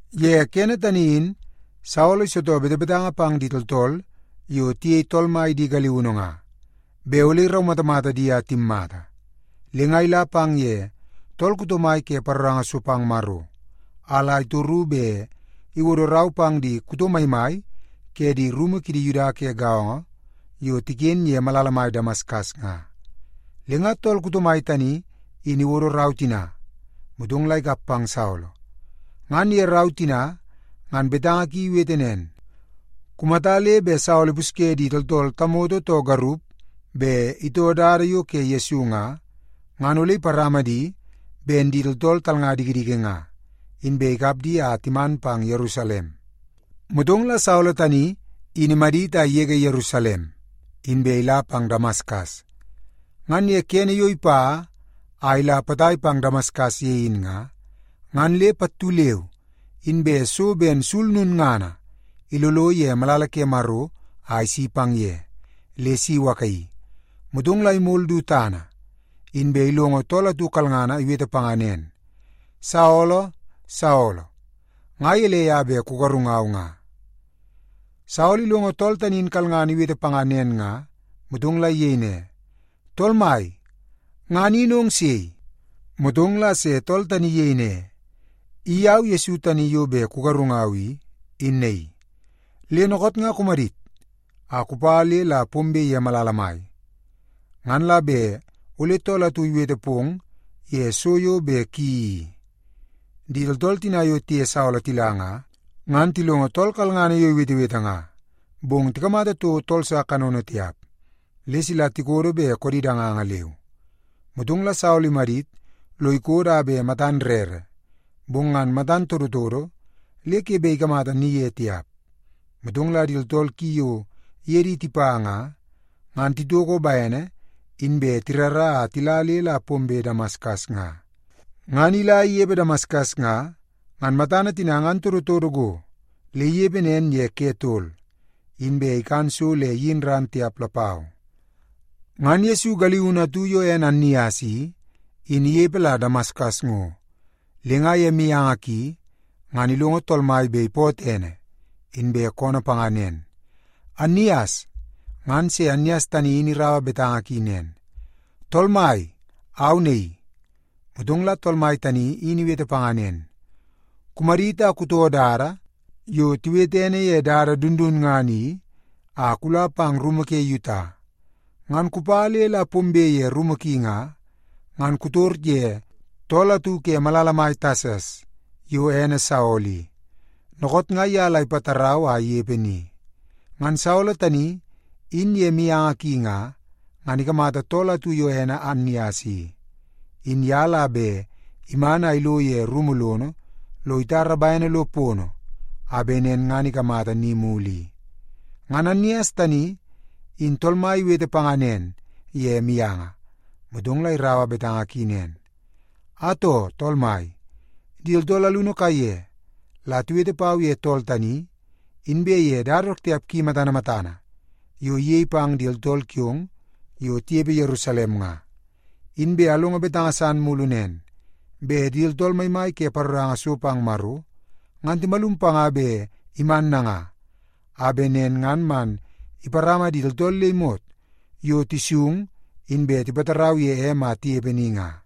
Ye kene tani in Saolo isitoo betebetanga pang di tooltool yo tiyei Tool Mai di galiunu nga, bet ole iraumatamata di a timmata. Le nga ila pang ye tool kuto mai ke paroranga so pang Maro, a la itoru bet iwodo rau pang di kuto maimai ke di rumu kidi Yuda ke gaongo yo tiken ye malala mai Damaskas nga. Le nga tool kuto mai tani in iwodo rau tina, motong la ikap pang Saolo. Ngan ye rau tina ngan betanga ki iwete nen, “Kumata le bet Saolo ipusye di tooltool tamoto too garup bet itoo Dada yo ke Yesu nga, ngan ole iparama di ben di tooltool talnga dikidiki nga, inbe ikap di a timan pang Yerusalem.” Motong la Saolo tani in imadit a igege Yerusalem, inbe ila pang Damaskas. Ngan ye kene yo ipa a ila potai pang Damaskas ye in nga, ngan le pattu leu inbe so ben sul lulngana ilolo ye malala ke Maro a isi pang ye, le si iwakaii. Motong la imol du tana, inbe ilongo tool atu kalngana iwete panga nen, “Saolo, Saolo, nga gelei a bet kugarungau nga?” Saolo ilongo tool tani in kalngana iwete panga nen nga, motong la iyei ne, “Tool Mai, ngan in ong sei?” Motong la se tool tani iyei ne, “I au Yesu tani yo bet kugarungau i, in naii. Le dookoot nga kumadit a kupa le la pombe ye malala mai. Ngan la bet ole tool atu iwete pong ye so yo bet kuyeii i.” Di tooltool tina yo tiye Saolo tila nga, ngan tilongo tool kalngana yo iwetewete nga, bong tikamata toko tool sa kanono tiap, le sila tikodo bet koodi danganga leu. Motong la Saolo imadit lo ikodo a bet matan rere, bong ngan matan todotodo le ke bet ikamata ni ye tiap. Motong la di tooltool ki yo iye di tipa nga, ngan titoko bene inbe tirara a tila le la pombe Damaskas nga. Ngan ila inepe Damaskas nga, ngan matana tina ngan todotodo go le inepe nen ye ke tol, inbe ikan so le iyin ran tiap lapau. Ngan Yesu galiunu atu yo ene Annias i, in inepe la Damaskas ngo. Le nga ye mianga ki ngan ilongo Tool Mai bet ipootoo ene, inbe koonoo panga nen, “Annias.” Ngan se Annias tani in iraua betanga ki nen, “Tool Mai, au naii.” Motong la Tool Mai tani in iwete panga nen, “Kumadit a kutoo dada yo tiwete ene ye Dada Dundunngana i a kula pang rumu ke Yuta. Ngan kupa le la pombe ye rumu ki nga, ngan kutor ye tool atu ke malala mai Tasas yo ene Saolo i. Dookoot nga ye la ipatarau a inepe ni. Ngan Saolo tani in ye mianga ki nga, ngan ikamata tool atu yo ene Annias i, in ye la bet iman a ilo ye rumu lono lo itara bene lo pono, a bet nen ngan ikamata ni mulu i.” Ngan Annias tani in Tool Mai iwete panga nen ye mianga, motong la iraua betanga ki nen, “Atoo, Tool Mai, di tooltool alunu kaiye la tiwete pau ye tool tani, inbe ye dada dook tiap ki matana matana yo iyei pang di tooltool kiong yo tinepe Yerusalem nga. Inbe alongo betanga san mulu nen, bet di tooltool maimai ke paroranga so pang Maro ngan timalum panga bet iman nanga, a bet nen ngan man iparama di tooltool le imot yo tisung inbe tipatarau ye em a tinepe ni nga.”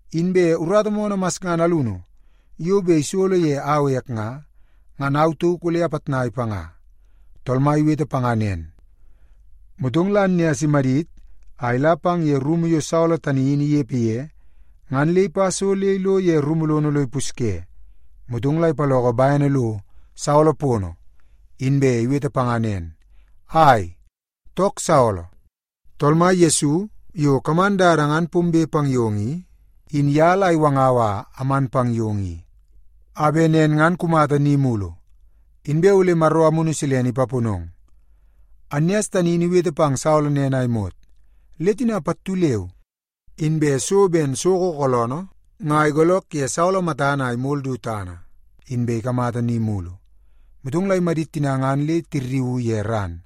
Inbe urata moonoo masngana alunu yo bet isolo ye au ek nga, ngan au tauk ole apitnai panga.” Tool Mai iwete panga nen, motong la Annias imadit a ila pang ye rumu yo Saolo tani in inepe ye, ngan le ipa so le ilo rumu lono lo ipusye. Motong la ipaloko bene lo Saolo pono, inbe iwete panga nen, “Ai, took Saolo! Tool Mai Yesu yo kaman dada ngan pombe pang yong i, in ye la iwangau a aman pang yong i, a bet nen ngan kumata ni mulu, inbe ole Maro Amunu Silene ipaponong.” Annias tani in iwete pang Saolo nen a imot, le tina pattu leu inbe so ben soko kooloonoo nga igoolook ye Saolo matana a imol du tana, inbe ikamata ni mulu. Motong la imadit tina ngan le tirriuu ye ran,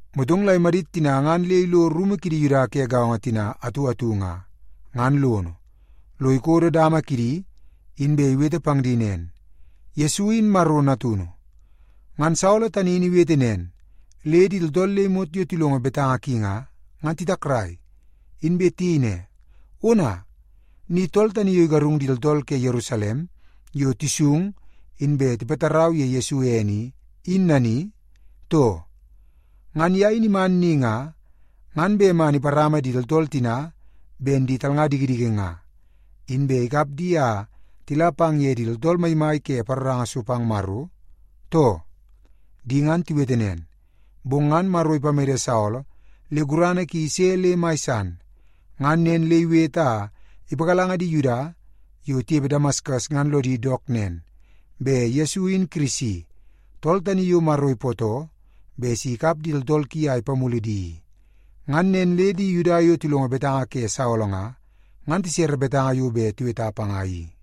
Motong la imadit tina ngan le ilo rumu kidi Yuda ke gaongo tina atu atu nga, ngan lono, lo ikodo dama kidi, inbe iwete pang di nen, “Yesu in Maro Natunu.” Ngan Saolo tani in iwete nen, le di tooltool le imot yo tilongo betanga ki nga, ngan titakrai. Inbe tiyei ne, “Ona, ni tool tani yo igarung di tooltool ke Yerusalem yo tisung inbe tipatarau ye Yesu ene i, in nani, too? Ngan ye in iman ni nga, ngan bet man iparama di tooltool tina ben di talnga dikidiki nga, inbe ikap di a tila pang ye di tooltool maimai ke paroranga so pang Maro, too?” Di ngan tiwete nen, bong ngan Maro ipamede Saolo le gurana ki ise le mai san. Ngan nen le iwete a ipagalanga di Yuda yo tinepe Damaskas ngan lodi dook nen, bet Yesu in Kirisi, tool tani yo Maro ipootoo bet si ikap di tooltool ki a ipamulu di i. Ngan nen le di Yuda yo tilongo betanga ke Saolo nga, ngan tisere betanga yo bet tiweta panga i.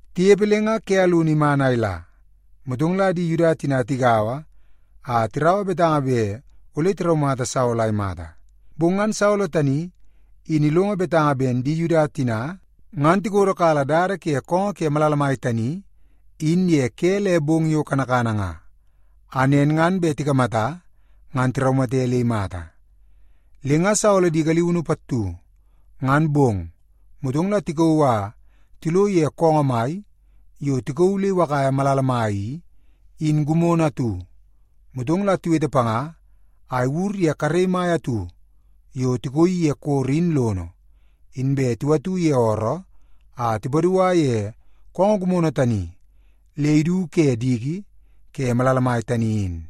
Tinepe le nga ke alunu iman a ila, motong la di Yuda tina tigaua a tiraua betanga bet ole tiraumata Saolo a imata. Bong ngan Saolo tani in ilongo betanga ben di Yuda tina, ngan tikodokala dada ke koongoo ke malala mai tani in ye ke le bong yo kanakana nga, a nen ngan bet tikamata ngan tiraumate le imata. Le nga Saolo di galiunu pattu, ngan bong, motong la tikauu a tilo ye koongoo mai yo tikauu le iwakaia malala mai i, in gimono atu. Motong la tiwete panga a iwur ye karei mai atu yo tikooi ye koro in lono, inbe tiwatu ye ooroo a tipadua ye koongoo gimono tani le idu ke diki ke malala mai tani in.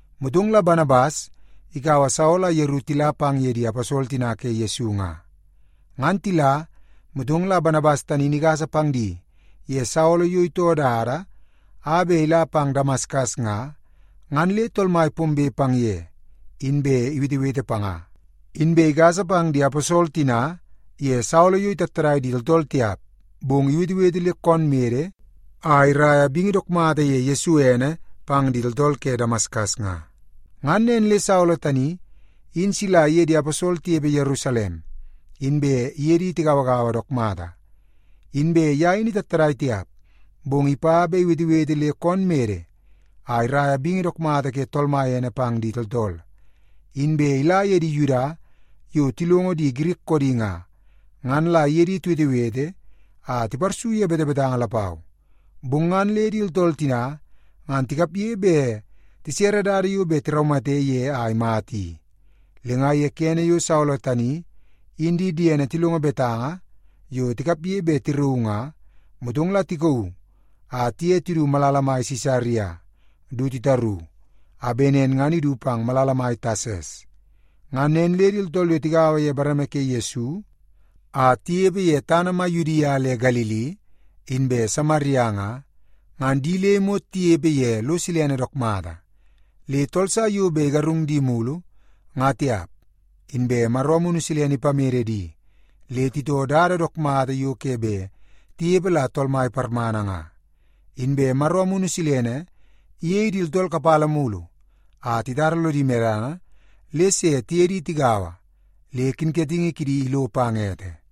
Motong la Banabas ikaua Saolo a yeru tila pang ye di aposol tina ke Yesu nga. Ngan tila, motong la Banabas tani in igasa pang di ye Saolo yo itoo dada a bet ila pang Damaskas nga, ngan le Tool Mai pombe pang ye, inbe iwetewete panga. Inbe igasa pang di aposol tina ye Saolo yo itattadai di tooltool tiap, bong iwetewete le koon mede a iraia bingi dook mata ye Yesu ene pang di tooltool ke Damaskas nga. Ngan nen le Saolo tani in sila iye di aposol tinepe Yerusalem, inbe iye di tigauagaua dook mata. Inbe ye in itattadai tiap, bong ipa bet iwetewete le koon mede a iraia bingi dook mata ke Tool Mai ene pang di tooltool. Inbe ila ye di Yuda yo tilongo di Girik koodi nga, ngan la iye di tiwetewete a tiparsu ye betebetanga lapau. Bong ngan le di tooltool tina ngan tikapge bet tisere dada yo bet tiraumate ye a imata i. Le nga ye kene yo Saolo tani in di diene tilongo betanga yo tikapge bet tirauu nga, motong la tikauu a tiye tidu malala mai Sisaria du titaru, a bet nen ngan idu pang malala mai Tasas. Ngan nen le di tooltool yo tigaua ye bareme ke Yesu a tinepe ye tana mai Yudia le Galili inbe Samaria nga, ngan di le imot tinepe ye lo silene dook mata. Le tool sa yo bet igarung di mulu, nga tiap, inbe Maro Amunu Silene ipamede di, le titoo dada dook mata yo ke bet tinepe la Tool Mai parmana nga. Inbe Maro Amunu Silene iyei di tooltool kapala mulu a titara lodi medana le se tiye di tigaua le kinkatingi kidi ilo pang ete.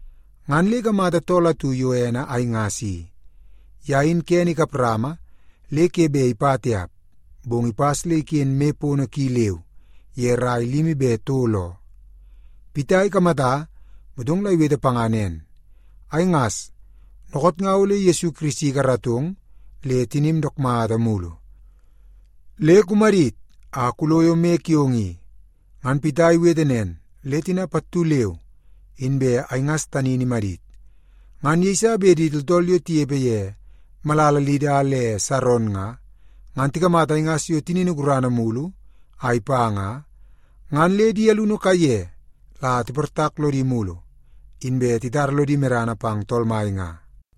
Ngan le ikamata tool atu yo ene Aingas i. Ye in kene ikap rama le ke bet ipa tiap, bong ipas le iken moi pono ki leu ye rai limi be tol oo. Pita ikamata, motong la iwete panga nen, “Aingas, dookoot nga ole Yesu Kirisi ikaratong le tinim dook mata mulu. Le kumadit a kuloyo moi kiong i.” Ngan Pita iwete nen, le tina pattu leu inbe Aingas tani in imadit. Ngan yeiso bet di tooltool yo tinepe ye malala Lida le Saron nga, ngan tikamata Aingas yo tinini gurana mulu a ipa nga, ngan le di alunu kaiye la tiportak lodi mulu, inbe titara lodi medana pang Tool Mai nga.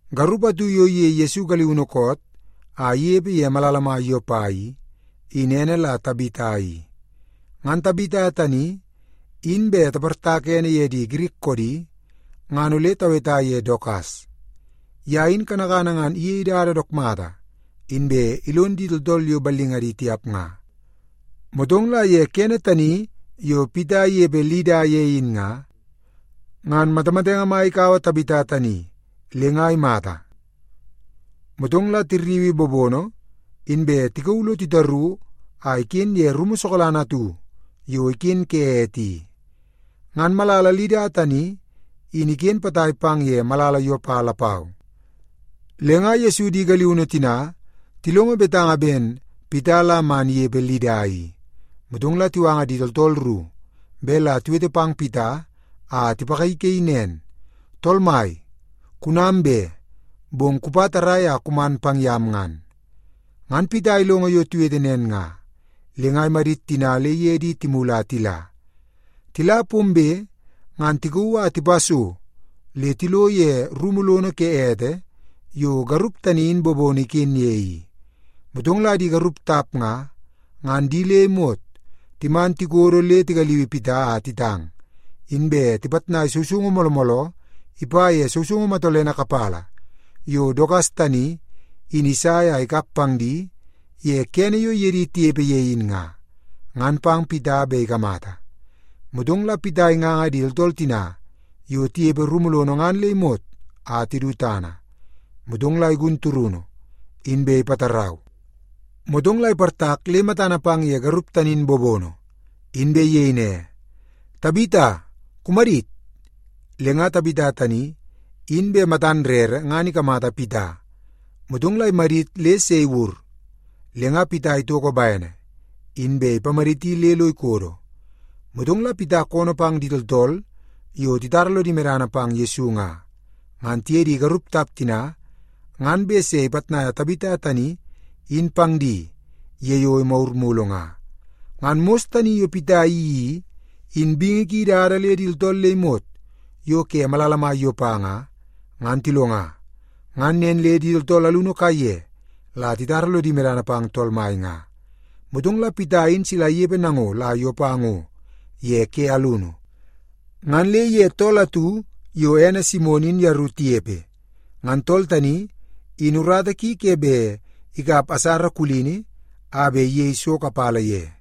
Garup atu yo iyei Yesu galiunu koot a inepe ye malala mai Yopa i, in ene la Tabita i. (Ngan Tabita tani in bet taportaka ene ye di Girik koodi, ngan ole taweta ye Dokas). Ye in kanakana ngan iyei dada dook mata, inbe ilon di tooltool yo ballingadi tiap nga. Motong la ye kene tani yo Pita inepe Lida ye in nga, ngan matamatenge mai ikaua Tabita tani le nga imata. Motong la tirriui bobono, inbe tikauu lo titaru a iken ye rumu sokalana atu yo iken ke ete i. Ngan malala Lida tani, in iken potai pang ye malala Yopa lapau, le nga Yesu di galiunu tina tilongo betanga ben Pita la man inepe Lida i. Motong la tiwanga di tooltool ru bet la tiwete pang Pita a tipagaigaii nen, “Tool mai, kunam be, bong kupa tarrai a kuman pang yam ngan.” Ngan Pita ilongo yo tiwete nen nga, le nga imadit tina le iye di timulu a tila. Tila pombe, ngan tikauu a tipa so le tilo ye rumu lono ke ete yo garup tani in bobono iken ye i. Motong la di garup tap nga, ngan di le imot timan tikodo le tigaliui Pita a titang, inbe tipitnai sousoungu mooloo mooloo ipa ye sousoungu matolene kapala yo Dokas tani, in isai a ikap pang di ye kene yo iye di tinepe ye in nga, ngan pang Pita bet ikamata. Motong la Pita inganga di tooltool tina yo tinepe rumu lono ngan le imot a tidu tana. Motong la igun turunu, inbe ipatarau. Motong la iportak le matana pang ye garup tani in bobono, inbe iyei ne, “Tabita, kumadit!” Le nga Tabita tani, in bet matan rere ngan ikamata Pita, motong la imadit le se iwur. Le nga Pita itoko bene, inbe ipamaditi le lo ikodo. Motong la Pita koonoo pang di tooltool yo titara lodi medana pang Yesu nga, ngan tiye di garup tap tina ngan bet se ipitnaia Tabita tani in pang di ye yo imagur mulu nga. Ngan mos tani yo Pita iyeii i, in bingi ki idada le di tooltool le imot yo ke malala mai Yopa nga, ngan tilonga. Ngan nen le di tooltool alunu kaiye la titara lodi medana pang Tool Mai nga. Motong la Pita in sila inepe nango la Yopa ngo ye ke alunu. Ngan le iye tool atu yo ene Simon in yeru tinepe. Ngan tool tani in urata ki ke bet ikap asara kulini a bet iyei so kapala ye.